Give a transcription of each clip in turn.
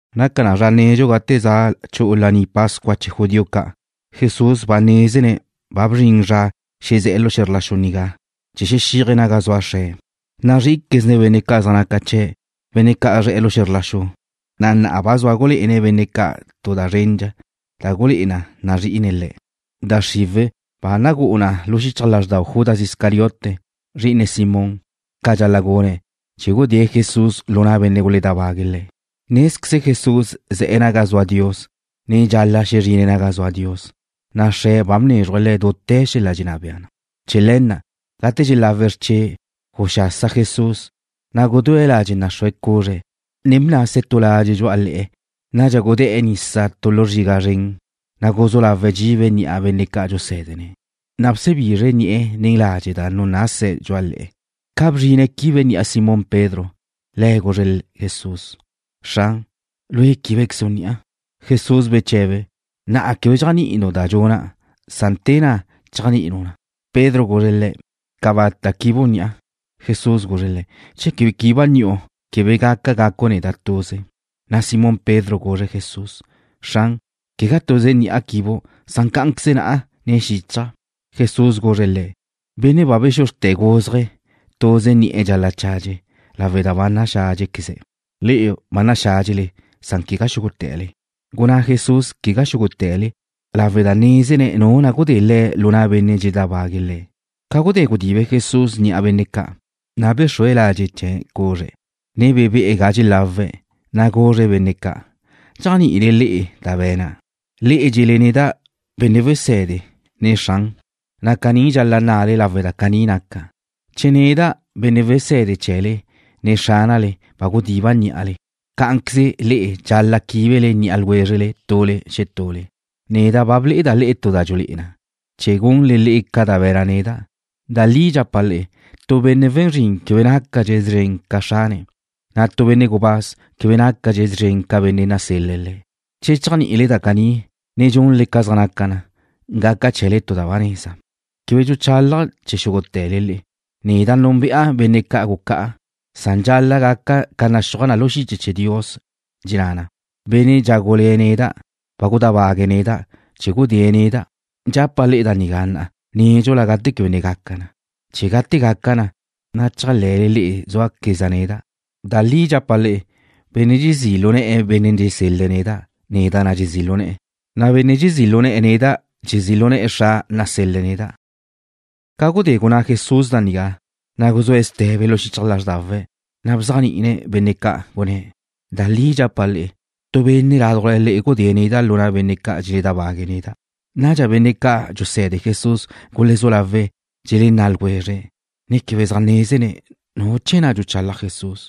Naca na zra nedxu gate za chu'u Laní Pascua chee̱ judío ca'. Jesús ba nézene̱' ba bzrin zra xezé̱'e̱ lu xe̱zr la xu nigá chee̱ xexíaje̱' naga zua Xre̱'. Nazrí'iquezne̱' benne' zaj naca chee̱', benne' zaj zre̱'e̱ xe̱zr la xu, na' na'a ba zua gulé'ene̱' benne' ca' tu da zrendxa da gulé'e na nazrí'ine̱' le̱'. Da xriwe̱' ba nagú'u na xichaj lázxdau Judas Iscariote, zri'ine Simón, ca dxal-la' gune̱' chee̱ gudée̱' Jesús lu na' benne' guledábague̱' Le̱'. Nézqueze Jesús ze̱'e̱ naga zua Dios, ne dxal-la' xezrine̱' naga zua Dios, na' Xre̱' ba bnézruje̱' Le̱' dute̱ xel-la' dxenná bea. Chee̱ le̱ na', gate dxelawe̱' xrche', guxasa Jesús, na' gudúe̱' ladxe' naxrúa cuzre̱', ne bnase̱' tu ladxe' dxu'a le̱'e̱. Nadxa gudé̱'e̱ nisa tu zriga xia zren, ne guzú lawe̱' dxibe̱' ni'a benne' ca' dxusé̱dene̱', na' bsebizre̱' ni'e̱ nen ladxe' na' da nunase̱' dxu'a le̱'e̱. Ca bzrine̱' chee̱ quibe̱' ni'a Simón Pedro, le̱' guzre̱' Jesús: ―Xran, ¿Lue' quíbequezu' ni'a? Jesús beche̱be̱': ―Na'a quebe dxéajni'inu' da dxuna'. Te na'a chéajni'inu' na. Pedro guzre̱' Le̱': ―Cabata' quibu' ni'a. Jesús guzre̱' le̱': ―Che quebe quiba' ni'u, quebe gaca gacu' neda' tuze. Na' Simón Pedro guzre̱' Jesús: ―Xran, quegá tuze ni'a quibu'. Cá'anqueze na'a, ne xíchaja'. Jesús guzre̱' le̱': ―Benne' ba bexuzrte̱ guzje̱', tuze ni'e̱ dxal-la' chadxe lawe' da ba naxádxequeze̱'. Le'e ba naxádxele, san quegá xúgute̱le. Gunná Jesús: “Quegá xúgute̱le”, lawe' da nézene̱' nu na' gudée̱' Le̱' lu na' benne' dxeledábague̱' Le̱'. Ca gudé gudibe Jesús ni'a benne' ca', na' bexrúe̱' ladxe' chee̱' cuzre', ne bebe'e̱ ga dxelawe̱', na' guzre̱' benne' ca': ―¿Dxéajni'ile le'e da ba be̱na'? Le'e dxe̱le neda': Benne' Wese̱de, ne: Xran, na' caní dxal-la' nnale lawe' da caní naca'. Che neda', Benne' Weséde chee̱le, ne Xránale, ba gudiba' ní'ale, cá'anqueze le'e dxal-la' quíbele ni'a ljwézrele tule xetule. Neda' ba ble'eda' le'e tu da dxulé'e na, chee̱ gunle le'e ca da be̱na' neda'. Da li dxapa' le'e, tu benne' we̱n zrin quebe nácadxe̱' szren ca xrane̱', na' tu benne' gubáz quebe nácadxe̱' szren ca benne' nasel-le̱' le̱'. Che dxéajni'ile da caní, ne dxunle ca zaj naca na, gaca chee̱le tu da ba neza. ’Quebe dxuchálaja' chee̱ xúgute̱le le'e. Neda' núnbe'a benne' ca' gucá'a, san dxal-la' gaca ca naxúaj na lu xiche chee̱ Dios, dxenná na: Benne' dxágule̱ neda' ba gudábague̱' neda' chee̱ gudée̱' neda'. Dxapa' le'e da nigá na'a, nédxula gate quebe ne gaca na, chee̱ gate gaca na, na' chéajle̱le le'e zúaqueza' neda'. Da li dxapa' le'e: Benne' dxezí' lu ne̱'e̱ Bénnea' dxusel-le̱' neda', neda' na' dxezí' lu ne̱'e̱, na' benne' dxezí' lu ne̱'e̱ neda', dxezí' lu ne̱'e̱ Xra' nasel-le̱' neda'. Ca gudé gunná Jesús da nigá, na' guzúe̱' ste̱be lu xichaj lázrdawe̱', na' bzéajni'ine̱' benne' ca', gunné̱': ―Da li dxapa' le'e, tu benne' ládujla le'e gudée̱' neda' lu na' benne' ca' dxeledábague̱' neda'. Nadxa benne' ca' dxuse̱de Jesús gulezú lawe̱' dxelenná' ljwezre̱', ne quebe zaj nézene̱' nu chee̱ na' dxuchalaj Jesús.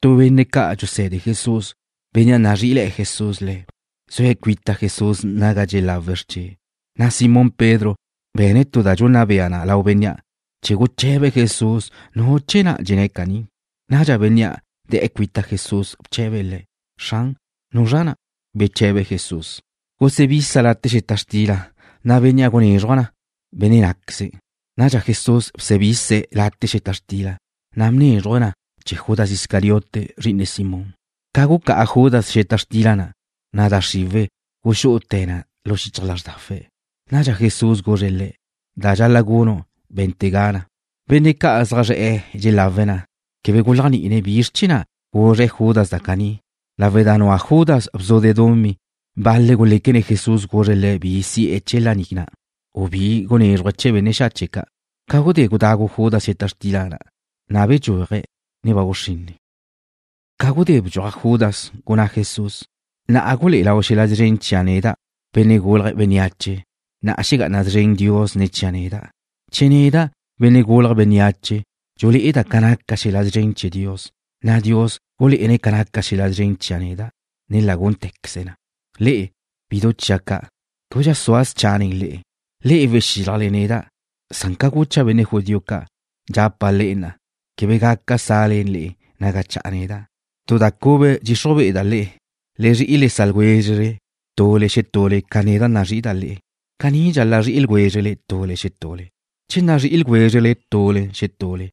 Tu benne' ca' dxuse̱de Jesús, bénnea' nazrí'ile̱'e̱ Jesús le̱', zue̱' cuita Jesús naga dxelawe̱' xrche', na' Simón Pedro be̱ne̱' tu da dxunna bea lau bénnea' chee̱ guche̱be̱' Jesús nu chee̱ na' dxenné̱' caní. Nadxa bénnea' de̱'e̱ cuita Jesús bche̱be̱' Le̱': ―Xran, ¿nuzra na'? Beche̱be Jesús: ―Gusebisa' late' xeta xtila, na' bénnea' gunézruja' na, benne' ná'queze̱'. Nadxa Jesús bsebise̱' late' xeta xtila, na' bnézruje̱' na chee̱ Judas Iscariote, zri'ine Simón. Ca gucá'a Judas xeta xtila na', na' da xriwe̱' guxú'ute̱ na lu xichaj lázrdawe̱'. Nadxa Jesús guzre̱' le̱': ―Da dxal-la' gunu', bé̱ntega na. Benne' ca' zaj zre̱'e̱ dxelawe̱' na' quebe guléajni'ine̱' bizr chee̱ na' guzre̱' Judas na' caní. Lawe' da nua Judas bzude' dumí, bal-le̱' guléquene̱' Jesús guzre̱' le̱' bi si'e̱ chee̱ laní na', u bi gunézruje̱' benne' xache' ca'. Ca gudé gudagu Judas xeta xtila na', na' bdxúaje̱'. Ba guxrinne. Ca gudé bdxuaj Judas, gunná Jesús: ―Na'a gulé'e lau xel-la' szren chia' neda', Benne' Gulje̱' Bénneache, na' xegá'ana szren Dios ne̱ chia' neda'. Che neda', Benne' Gulje̱' Bénneache, dxulé'eda' ca naca xel-la' szren chee̱ Dios, na' Dios gulé'ene̱' ca naca xel-la' szren chia' neda', ne la gúnte̱queze̱' na. Le'e, bidu chia' ca', québedxa sua' scha' nen le'e. Le'e wexílajle neda', san ca gucha' benne' judío ca', dxapa' le'e na'a, quebe gaca sa'le le'e naga cha'a neda'. Tu da cube dxixruj be'eda' le'e. Le zri'i le sa' ljwézrele tule xetule ca neda' nazrí'ida' le'e. Caní dxal-la' zri'i ljwézrele tule xetule. Che nazrí'i ljwézrele tule xetule,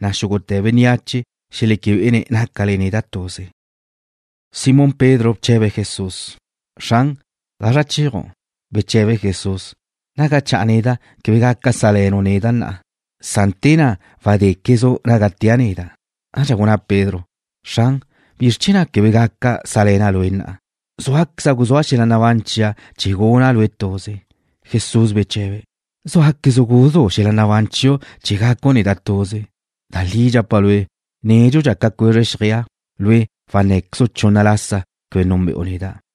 na' xúgute̱ bénneache xeleque bé'ene̱' nácale neda' tuze. Simón Pedro bche̱be̱' Jesús: ―Xran, ¿gazra chéaju'? Beche̱be Jesús: ―Naga cha'a neda', quebe gaca sá'le̱nu' neda' na'a. Te na'a wadéquezu' naga tea' neda'. Nadxa gunná Pedro: ―Xran, ¿bizr chee̱ na' quebe gaca sá'le̱na' Lue' na'a? Zúaqueza' guzúa' xel-la' nabán chia' chee̱ guna' Lue' tuze. Jesús beche̱be̱': ―¿Zúaquezu' guzú' xel-la' nabán chiu' chee̱ gacu' neda' tuze? Da li dxapa' lue', nédxudxa ca cuezre xjeaj, lue' wannáquezu' chunna lasa quebe núnbe'u neda'.